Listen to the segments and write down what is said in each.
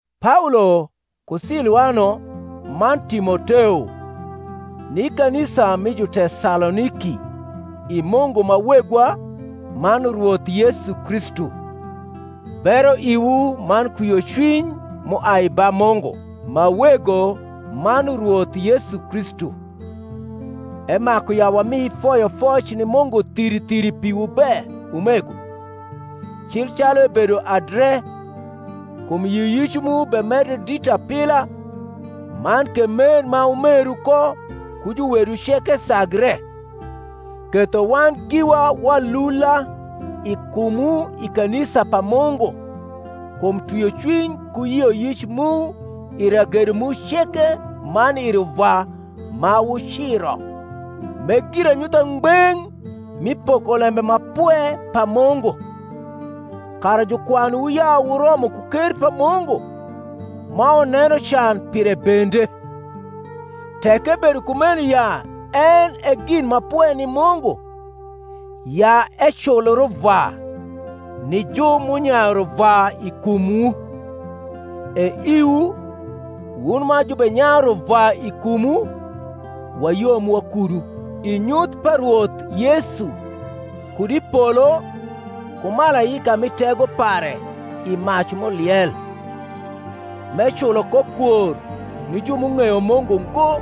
Paolo, ku Siluano, man Timoteo, ni kanisa mi Jutesaloniki i Mungu ma Wegwa man Rwoth Yesu Kristu; Bero iwu man kwiocwiny m’uai ba Mungu ma Wego man Rwoth Yesu Kristu. Emaku ya wami foyofoc ni Mungu thiri thiri piwu be, umego, cil calu ebedo adre, kum yioyic mu bemedre dit apila, man ke mer ma wumeru ko ku juwedu ceke sagre; ketho wan giwa walula i kumwu i kanisa pa Mungu kum twiocwiny ku yioyic mu i ragedo mu ceke man i ruvwa ma wuciro; m’e giranyutha ngbeng’ mi pokolembe ma pwe pa Mungu; kara jukwanwu ya wuromo ku ker pa Mungu, ma wuneno can pire bende: tek ebedo kumeno ya en e gin ma pwe ni Mungu ya ecul ruvwa ni ju m’unyayu ruvwa i kumwu, e iwu, wun ma jubenyayu ruvwa i kumwu, wayom wakudu, i nyuth pa Rwoth Yesu kud i polo ku malaika mi tego pare i mac m’uliel, m’eculo ko kwor ni ju m’ung’eyo Mungu ngo,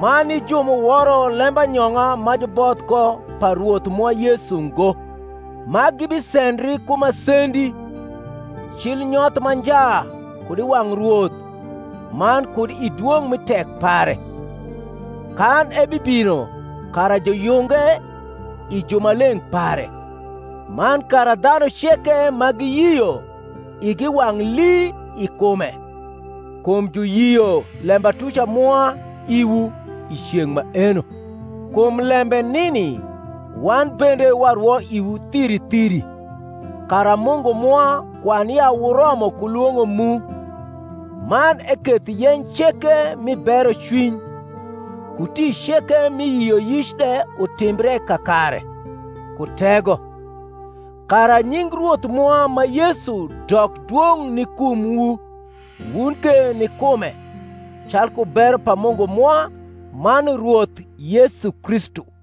man ni ju m’uworo lembanyong’a ma juboth ko pa Rwoth mwa Yesu ngo: ma gibisendri ku masendi, cil nyoth ma nja kud i wang’ Rwoth man kud i dwong’ mi tek pare, kan ebibino kara juyunge i jumaleng’ pare, man kara dhanu ceke ma giyio igi wang’ lii i kume (kum juyio lembatuca mwa iwu) i ceng’ maeno. Kum lembe nini wan bende warwo iwu thiri thiri, kara Mungu mwa kwan ya wuromo ku lwong’o mu, man eketh yeny ceke mi berocwiny, ku tic ceke mi yioyic de utimbre kakare, ku tego: kara nying Rwoth mwa ma Yesu dok dwong’ ni kumwu, wun ke ni kume, calku bero pa Mungu mwa man Rwoth Yesu Kristu.